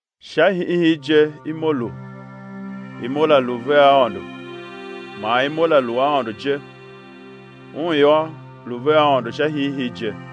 Sha hiihii je Imo lu; Imo la lu vea Aôndo, man Imo la lu Aôndo je. Un yô, lu vea Aôndo sha hiihii je.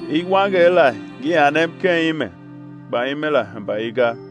Iwanger la ngi anem ken ime, kpa ime la hemba i ga.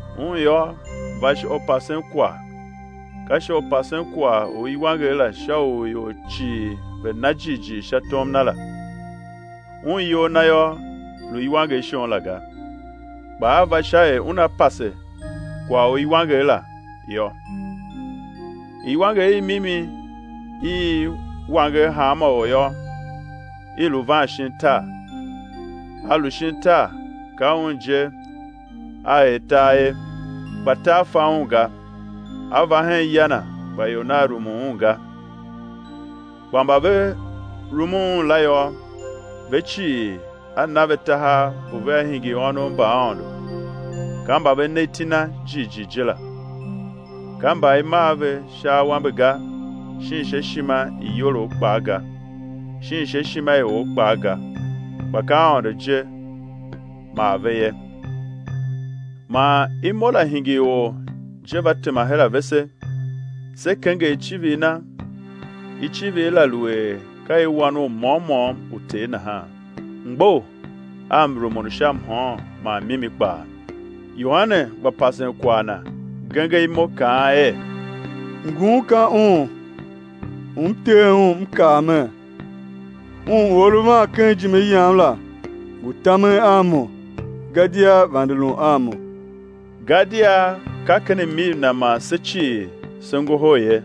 Un yô, va sha u pasen kwagh, ka sha u pasen kwagh u iwanger la sha u ior cii ve̱ na jighjigh sha tom na la. Un iyol na yô, lu iwanger shon la ga, kpa a va sha er una pase kwagh u iwanger la yô. Iwanger i mimi i i wanger hanma or yô, i lu van shin tar. A lu shin tar, ka Un je A er tar ye; kpa tar fa Un ga. A va hen ya Na kpa ior Nav rumun Un ga. Kpa mba ve rumun Un la yô, ve cii A na ve tahav mbu vea hingir ônov mba Aôndo, ka mba ve ne iti Na jighjigh je la; ka mba i mar ve sha awambe ga, shin sha ishima i iyolough kpaa ga, shin sha ishima i or kpaa ga, kpa ka Aôndo je mar ve ye. Man Imo la hingir or je, va tema her a vese, se kenger icivir Na, icivir la lu er ka i Wan u môm môm u Ter nahan, mgbough a mrumun u sha mhôôn man mimi kpaa. Yohane gba pasen kwagh Na, genger imo kaan er: Ngun ka Un u m ter Un, m kaa mer, Un u A lu van ken ijime yam la, ngu tamen a mo, gadia vande lun a mo. Gadia ka ken m-iv Na man se cii se ngohol ye,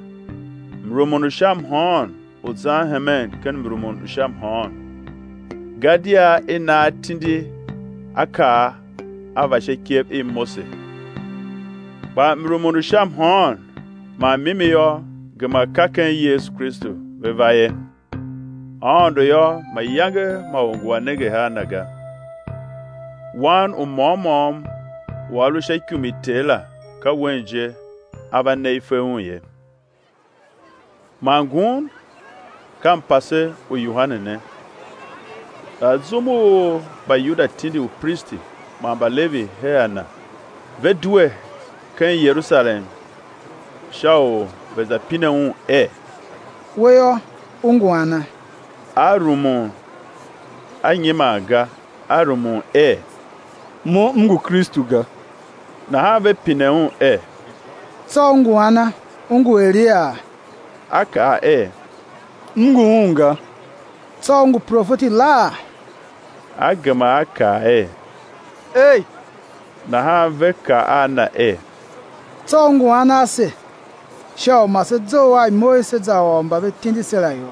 mrumun u sha mhôôn u zan hemen ken mrumun u sha mhôôn. Gadia i na atindiakaa a va sha ikev i Mose, kpa mrumun u sha mhôôn man mimi yô, gema ka ken Yesu Kristu ve va ye. Aôndo yô, mayange ma or ngu a nenge a Na ga; Wan u môm môm u A lu sha ikum i Ter la, ka Wen je A va ne i fe Un ye. Man ngun ka mpase u Yohane ne, zum u Mbayuda tindi upristi man Mbalevi her a na; ve due ken Yerusalem sha u ve̱ za pine un er: We yô u ngu ana? A rumun, a nyiman ga; a rumun er: Mo m ngu Kristu ga. Nahan ve pine un er: Tsô u ngu ana? U ngu Eliya? A kaa er: M ngu un ga. Tsô u ngu profeti laa? A gema a kaa er: Ei! Nahan ve kaa a na er: Tsô, u ngu an ase? Sha u ma se zough a imo i se za ôr mba ve tindi se la yô;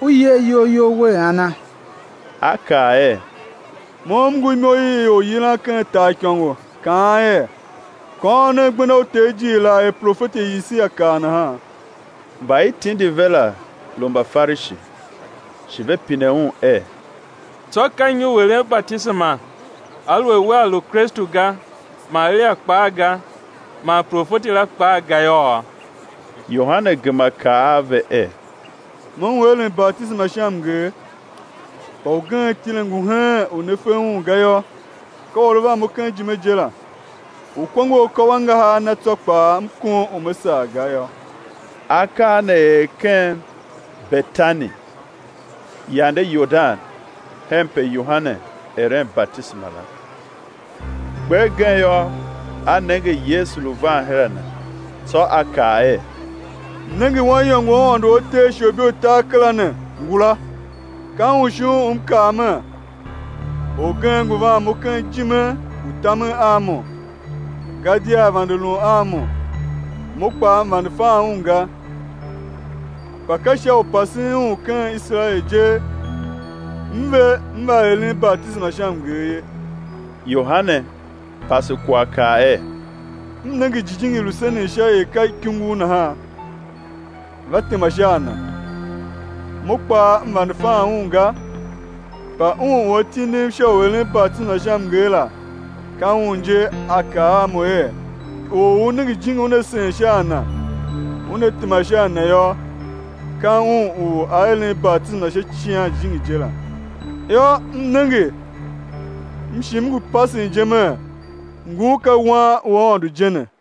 u yer iyol you wer ana? A kaa er: Mo M ngu imo i oryilan ken taaikôngo, kaan er: Kôôm nen gbenda u Ter jighilaa er profeti Yesaia kaa nahan. Mba i tindi ve la lu Mbafarishi. Shi ve pine un er: Tsô ka nyi u eren batisema aluer wea lu Kristu ga, man Eliya kpaa ga man profeti la kpaa ga yôô? Yohane gema kaa a ve er: Mo m ngu eren batisema sha mnger, kpa Ugen tile ngu heen u ne fe Un ga yô; ka u A lu van mo ken ijime je la, u kwange u akôvangahar a Na tsô kpaa m kom u me sagh ga yô. Akaa ne er ken Betani yande Yordan, henpe Yohane eren batisema la. Kper gen yô, a nenge Yesu lu van her a na, tsô a kaa er: Nenge Waniyôngo u Aôndo u A tee isholibo i tar kera ne, Ngula. Ka Un shon u m kaa mer: Orgen ngu van mo ken ijime ngu tamen a mo, gadia A vande lun a mo. Mo kpaa m vande fan Un ga, kpa ka sha u pasen Un ken Iserael je m ve m va eren batisema sha mnger ye. Yohane pase kwagh, kaa er: M nenge Jijingi lu senen Sha er ka ikungugh nahan, va tema sha a Na. Mo kpaa m vande fan Un ga; kpa Un u A tindim sha u eren batisema sha mnger la, ka Un je A kaa a mo er: Or u u nenge Jijingi Una sen sha a Na, Una tema sha a na yô, ka Un u A eren batisema sha icighan Jijingi je la. Yô, m nenge, m shi m ngu pasen je mer: Ngun ka Wan u Aôndo je ne.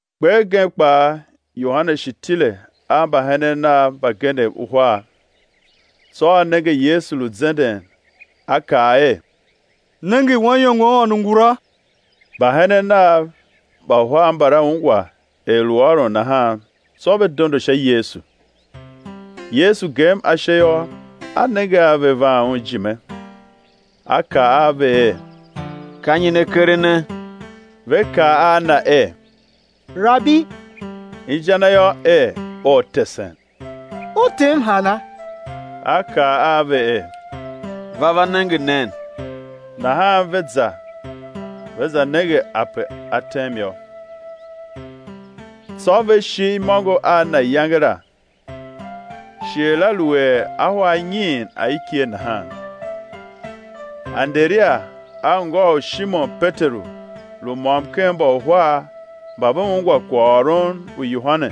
Kper gen kpaa Yohane shi tile a mbahenen nav mbagenev uhar. Tsô a nenge Yesu lu zenden, a kaa er: Nenge, Waniyôngo u Aôndo Ngula! Mbahenen nav mba uhar mbala ungwa er lu ôron nahan, tsô ve dondo sha Yesu. Yesu gem ashe yô, A nenge a ve van Un ijime, A kaa a ve er: Ka nyi ne kerene? Ve kaa a Na er: Rabi (inja na yô er, Ortesen) U tem hana? A kaa a ve er: Va va nenge nen! Nahan ve za, ve za nenge ape A tem yô; tsô ve shi imôngo a Na iyange la. Shighe la lu er ahwa anyiin aikighe nahan. Anderia anngô u Shimon Peteru lu môm ken mba uhar mba ve ungwa kwaghôron u Yohane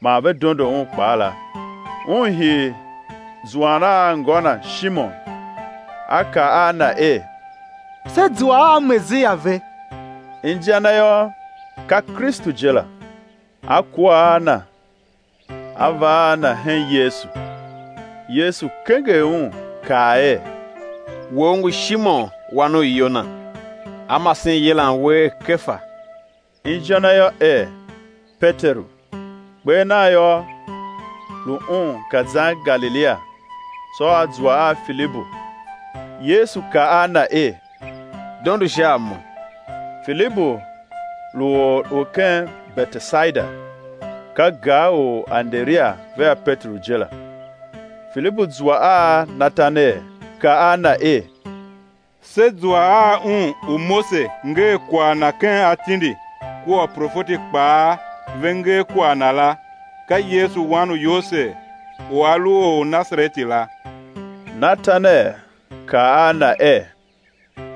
man ve dondo Un kpaa la. Un hii zuan a anngô na Shimon a kaa a na er: Se zua a Mesiya ve (inja na yô, ka Kristu je la.) A kua a na a va a na hen Yesu. Yesu kenger un kaa er: We u ngu Shimon, wan u Yona, á masen yilan we er Kefa (inja na yô er Peteru). Kper nan yô, lu Un ka zan Galilia, tsô A zua a Filibu. Yesu kaa a na er: Dondo sha a Mo. Filibu lu or u ken Betesaida, ka gar u Anderia vea Peteru je la. Filibu zua a Natanael, kaa a na er: Se zua a Un u Mose nger kwagh Na ken atindi, kua uprofeti kpaa ve nger kwagh Na la, ka Yesu Wan u Yosev u a lu or u Nasareti la. Natanael kaa a na er: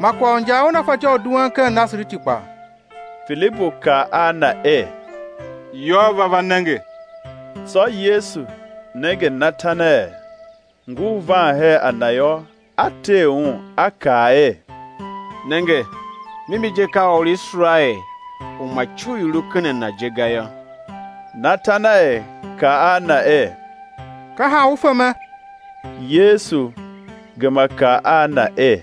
Ma kwagh u injaa una fatyô u duen ken Nasareti kpa? Filibu kaa a na er: Yô, va va nenge. Tsô Yesu nenge Natanael ngur van her a Na yô, A ter un a kaa er: Nenge, mimi je, ka or u Iserael u ma icugh i lu ken a na je ga yô. Natanael kaa a Na er: Ka han U feme? Yesu gema kaa a na er: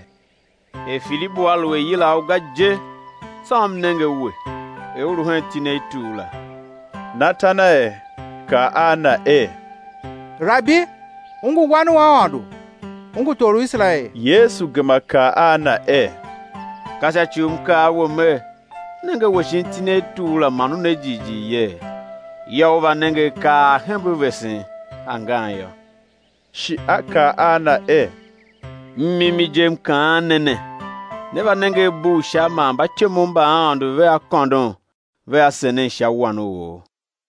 Er Filibu a lu a yila u ga je, tsô M nenge a we, er u lu hen itine i tur la. Natanael kaa a Na er: Rabi, U ngu Wan u Aôndo, U ngu tor u Iserael. Yesu gema kaa a na er: Ka sha ci u M kaa a we Mer, M nenge a we shin itine i tur la man u ne jighjigh yee? Yô, ú va nenge akaa a a hembe vesen a angan yô. Shi A kaa a na er: Mimi mimi je, M kaan ne ne, né va nenge á bugh Sha man mbatyomov mba Aôndo vea kôndon vea senen sha Wan u or.